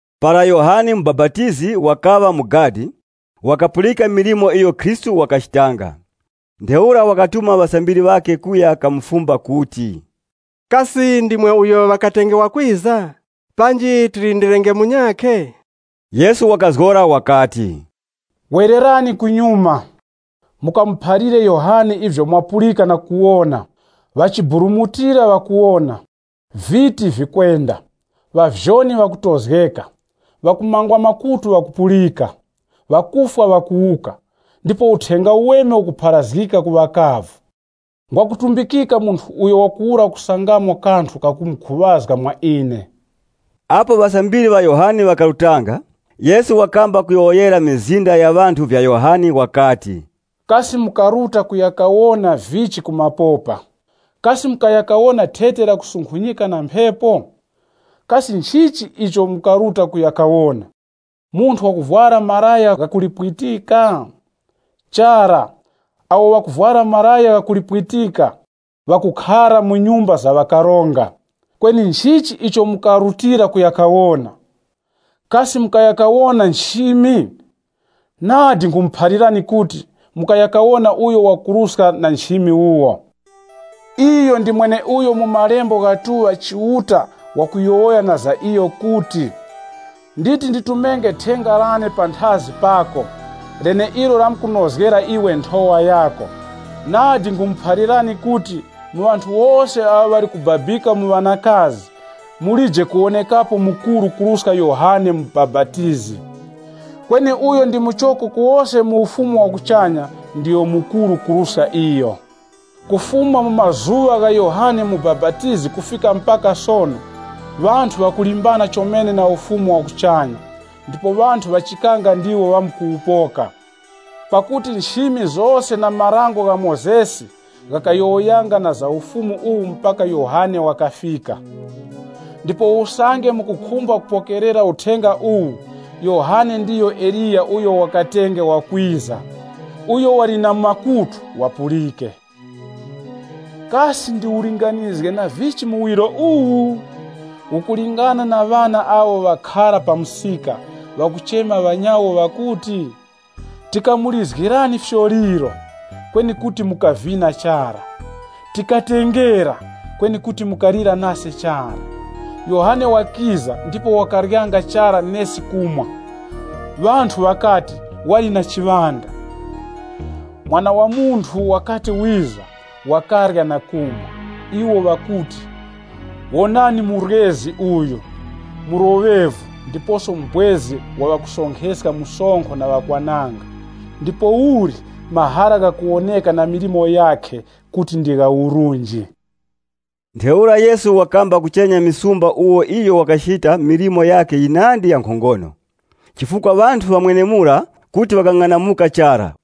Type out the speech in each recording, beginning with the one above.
Para Yohane Mubapatizi wakaŵa mu gadi, wakapulika milimo iyo Khristu wakachitanga. Ntheura wakatuma ŵasambiri ŵakhe kuya kamufumba kuti, “Kasi ndimwe uyo ŵakatenge wakwiza, panji tilindilirenge munyakhe?” Yesu wakazgora wakati, “Wererani kunyuma, mukamuphalire Yohane ivyo mwapulika na kuwona. Ŵachiburumutira ŵakuwona, viti vikwenda, ŵavyoni ŵakutozgeka, ŵakumangwa makutu ŵakupulika, ŵakufwa ŵakuwuka, ndipo Uthenga Uweme ukupharazgika ku ŵakavu. Ngwakutumbikika munthu uyo wakuwura kusangamo kanthu kakumukhuŵazga mwa ine.” Apo ŵasambiri ŵa Yohane ŵakarutanga, Yesu wakamba kuyowoyera mizinda ya ŵanthu vya Yohane, wakati, “Kasi mukaruta kuya kawona vichi ku mapopa? Kasi mukaya kawona thete lakusunkhunyika na mphepo? Kasi nchichi icho mukaruta kuya kawona? Munthu wakuvwara malaya gha kulipwitika? Chara, awo ŵakuvwara malaya gha kulipwitika ŵakukhara mu nyumba za ufumu. Kweni nchichi icho mukarutira kuya kawona? Kasi mukaya kawona nchimi? Nadi, nkhumuphalirani kuti, mukaya kawona uyo wakuruska na nchimi wuwo. Iyo ndi mweneuyo mu malembe ghatuŵa Chiuta wakuyowoya na za iyo kuti, ‘Wonani, nditi nditumenge thenga lane panthazi pako, leneilo lamkunozgera iwe nthowa yako.’ Nadi, nkhumuphalirani kuti, mu ŵanthu wose awo ŵali kubabika mu ŵanakazi, mulije kuwonekapo mukuru kuruska Yohane Mubapatizi. Kweni uyo ndi muchoko ku wose mu Ufumu wa kuchanya ndiyo mukuru kuruska iyo. Kufuma mu mazuŵa gha Yohane Mubapatizi kufika mpaka sono, ŵanthu ŵakulimbana chomene na Ufumu wa kuchanya, ndipo ŵanthu ŵachikanga ndiwo ŵamkuwupoka. Pakuti nchimi zose na Dango la Mozesi ghakayowoyanga na za Ufumu uwu mpaka Yohane wakafika. Ndipo usange mukukhumba kupokerera uthenga uwu, Yohane ndiyo Eliya uyo ŵakatenge wakwiza. Uyo wali na makutu, wati wapulike. “Kasi ndiwulinganizge na vichi muwiro uwu? Ukulingana na ŵana awo ŵakhara pa msika, ŵakuchema ŵanyawo ŵakuti, ‘Tikamulizgirani fyoliro, kweni kuti mukavina chara. Tikatengera, kweni kuti mukalira chara.’ Yohane wakiza ndipo wakaryanga chara nesi kumwa, ŵanthu ŵakati, ‘Wali na chiŵanda.’ Mwana wa Munthu wakati wiza, wakarya na kumwa, iwo ŵakuti, ‘Wonani muryezi uyu, mloŵevu ndiposo mubwezi wa ŵakusonkheska msonkho na ŵakwananga!’ Ndipouli, mahara ghakukhozgeka na milimo yakhe kuti nga urunji.” Ntheura Yesu wakamba kuchenya misumba umo iyo wakachita milimo yakhe yinandi ya nkhongono, chifukwa ŵanthu ŵa mwenemura kuti ŵakang'anamuka chara.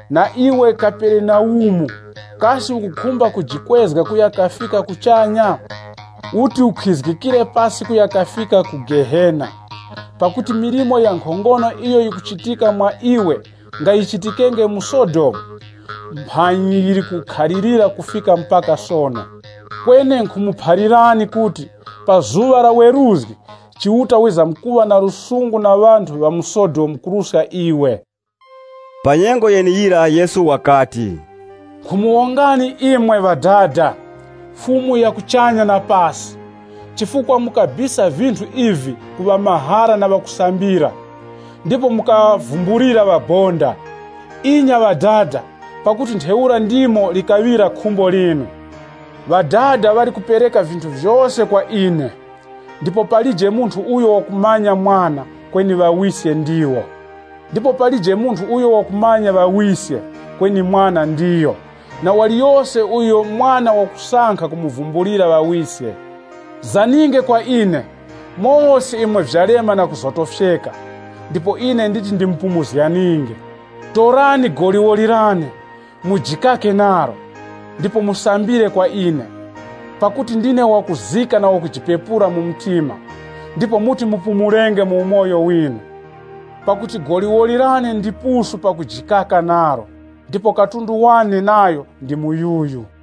Na iwe Kaperenaumu, kasi ukukhumba kujikwezga kuya kafika kuchanya? Uti ukhizgikire pasi kuya kafika ku Gehena Pakuti milimo ya nkhongono iyo yikuchitika mwa iwe nga yichitikenge mu Sodomu, mphanyi yili kukhalirira kufika mpaka sono. Kweni nkhumuphalirani kuti, pa zuŵa la weruzgi, Chiuta wizamkuŵazizipizgira ŵanthu ŵa mu Sodomu kuruska iwe.” Pa nyengo yeneyira Yesu wakati, Nkhumuwongani imwe, Ŵadada, Fumu ya kuchanya na pasi, chifukwa mukabisa vinthu ivi ku ŵamahara na ŵakusambira, ndipo mukaŵavumbulira ŵabonda. Inya Ŵadada, pakuti ntheura ndimo likaŵira khumbo linu. “Ŵadada ŵali kupereka vinthu vyose kwa ine, ndipo palije munthu uyo wakumanya Mwana, kweni Ŵawiske ndiwo. Ndipo palije munthu uyo wakumanya Ŵawiske, kweni Mwana ndiyo, na waliyose uyo Mwana wakusankha kumuvumbulira Ŵawiske. “Zaninge kwa ine, mose imwe vyalema na kuzotofyeka, ndipo ine nditi ndimupumuzganinge. Torani goliwoli lane, mujikake nalo, ndipo musambire kwa ine. Pakuti ndine wakuzika na wakujipepura mu mtima, ndipo muti musangenge kupumula kwa mizimu yinu. Pakuti goliwoli lane ndipusu pakujikaka nalo, ndipo katundu wane nayo ndi muyuyu.”